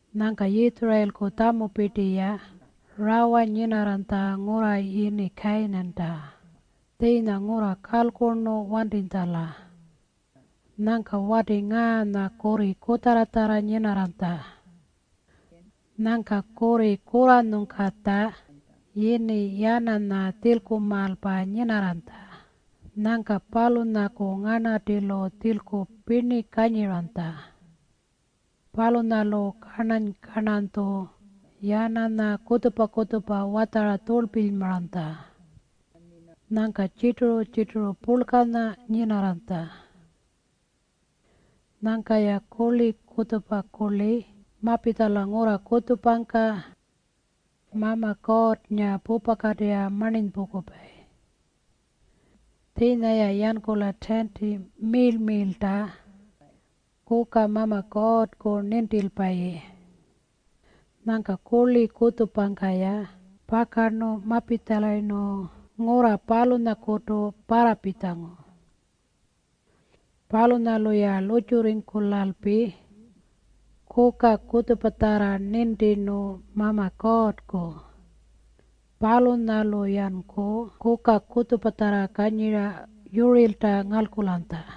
Nyangka Yitjurayilku tjamupirti-ya rawa nyinarranytja ngurra yini Kayinanta, tjiinya ngurra kalkurnu wantitjala. Nyangka wati ngaanya kurri kutjarratjarra nyinarranytja. Nyangka kurri kurranyungkatja yini Yananya tjilkumaalpa nyinarranytja. Nyangka palunyaku nganartilu tjilku pirni kanyiranytja. Palunyalu karnany-karnanytju Yananya kutjupa-kutjupa watjara tjurlpilymaranytja. Nyangka tjirturu-tjirturu purlkanya nyinarranytja. Nyangka-ya kurli kutjupa kurli mapitjala ngurra kutjupangka Mama Kuurrnga pupakatirra marninypungkupayi. Tjiinya-ya yankula tiinti miirl-miirlta kuka Mama Kuurrku nintilpayi. Nyangka kurli kutjupangka-ya pakara mapitjalayirnu ngurra palunyakutu parrapitjangu. Palunyalu-ya lurrtjurringkulalpi kuka kutjupatjarra nintirnu Mama Kuurrku. Palunyalu-yanku kuka kutjupatjarra kanyira yurirlta ngalkulanytja.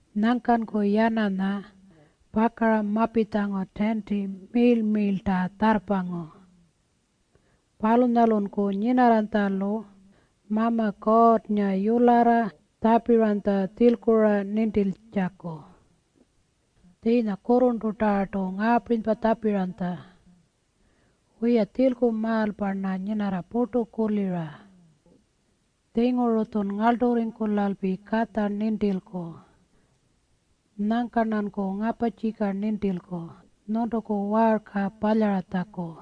Nyangkanku Yananya pakara mapitjangu tiinti miirl-miirlpangka tjarrpangu. Palunyalunku nyinarranytjalu Mama Kuurrnga yularra tjapiranytja tjilku-ra nintiltjaku. Tjiinya kurrurntutarrartu ngaapirinypa tjapiranytja, “Wiya, tjilkumaalpa-rna nyinarra purtu kulira. Tjinguru-tjun ngarlturringkulalpi katja nintilku. Nyangka-rnanku ngaparrtjika nintilku nyuntuku waarka palyaratjaku.”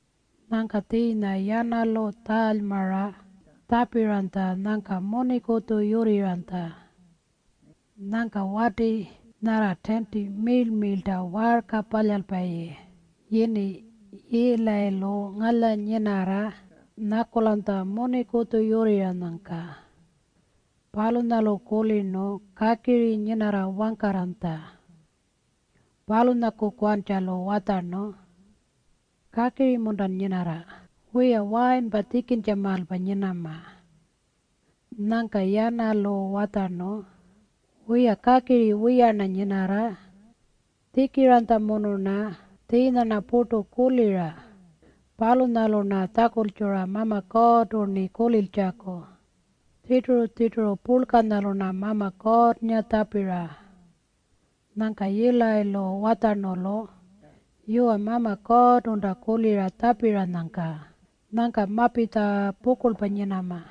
Nyangka tjiinya Yanalu tjaalymara tjapiranytja nyangka munikutju yurrirranytja. Nyangka wati nyarra tiinti miirl-miirlta waarka palyalpayi yini Yiilayilu ngalyanyinarra nyakulanytja munikutju yurrirranyangka. Palunyalu kulirnu kakiri nyinarra wangkarranytja. Palunyakukantjalu watjarnu, “Kakiri-muntan nyinarra? Wiya, wayinpa tjikintjamaalpa nyinama.” Nyangka Yanalu watjarnu, “Wiya, kakiri wiya-rna nyinarra. Tjikiranytjamunu-rna. Tjiinya-rna purtu kulira. Palunyalu-rna tjakultjura Mama Kuurrtu-rni kuliltjaku. Tjirturu-tjirturu purlkanyalu-rna Mama Kuurrnga tjapira.” Nyangka Yiilayilu watjarnu-lu, “Yuwa, Mama Kuurrtunta kulira tjapiranyangka. Nyangka mapitja pukurlpa nyinama.”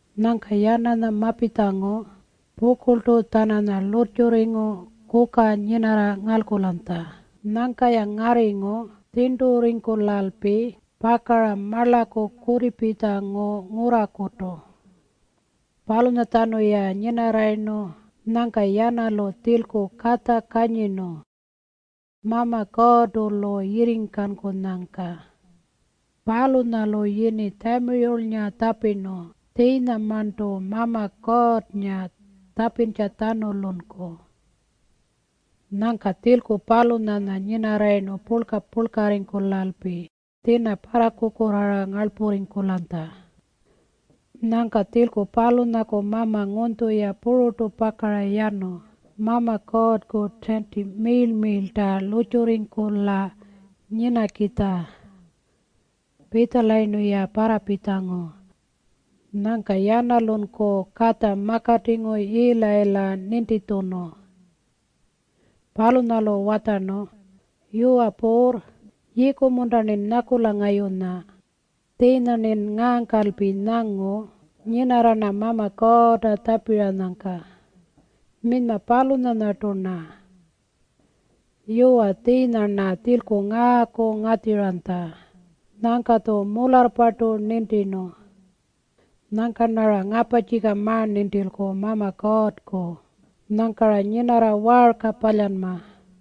Nyangka Yananya mapitjangu pukurltu-tjananya lurrtjurringu kuka nyinarra ngalkulanytja. Nyangka-ya ngarringu tjirnturringkulalpi pakara marlaku kutipitjangu ngurrakutu. Palunyatjanu-ya nyinarrayirnu, nyangka Yanalu tjilku katja kanyirnu Mama Kuurrtu-lu yirringkankunyangka. Palunyalu yini Tjamiyulnga tjapirnu tjiinyamarntu Mama Kuurrnga tjapintjatjanulunku. Nyangka tjilku palunyanya nyinarrayirnu purlka-purlkarringkulalpi tjina parrakukurraara ngarlpurringkulanytja. Nyangka tjilku palunyaku mama ngunytju-ya pururtu pakara yanu Mama Kuurrku tiinti miirl-miirlta lurrtjurringkula nyinakitja. Pitjalayirnu-ya parrapitjangu, nyangka Yanalunku katja makatingu Yiilayila nintitjunu. Palunyalu watjarnu, “Yuwa puurr, yiiku-munta-rnin ngayunya nyakula? Tjiinya-rnin ngaangkalpi nyangu nyinarra-rna Mama Kuurrta tjapiranyangka. Minyma palunyanyartu-rna. Yuwa, tjiinya-rna tjilku ngaaku ngatjiranytja. Nyangka-tju mularrpartu nintirnu. Nyangka-rnara ngaparrtjika ma-nintilku Mama Kuurrku. Nyangka-ra nyinarra waarka palyanma.”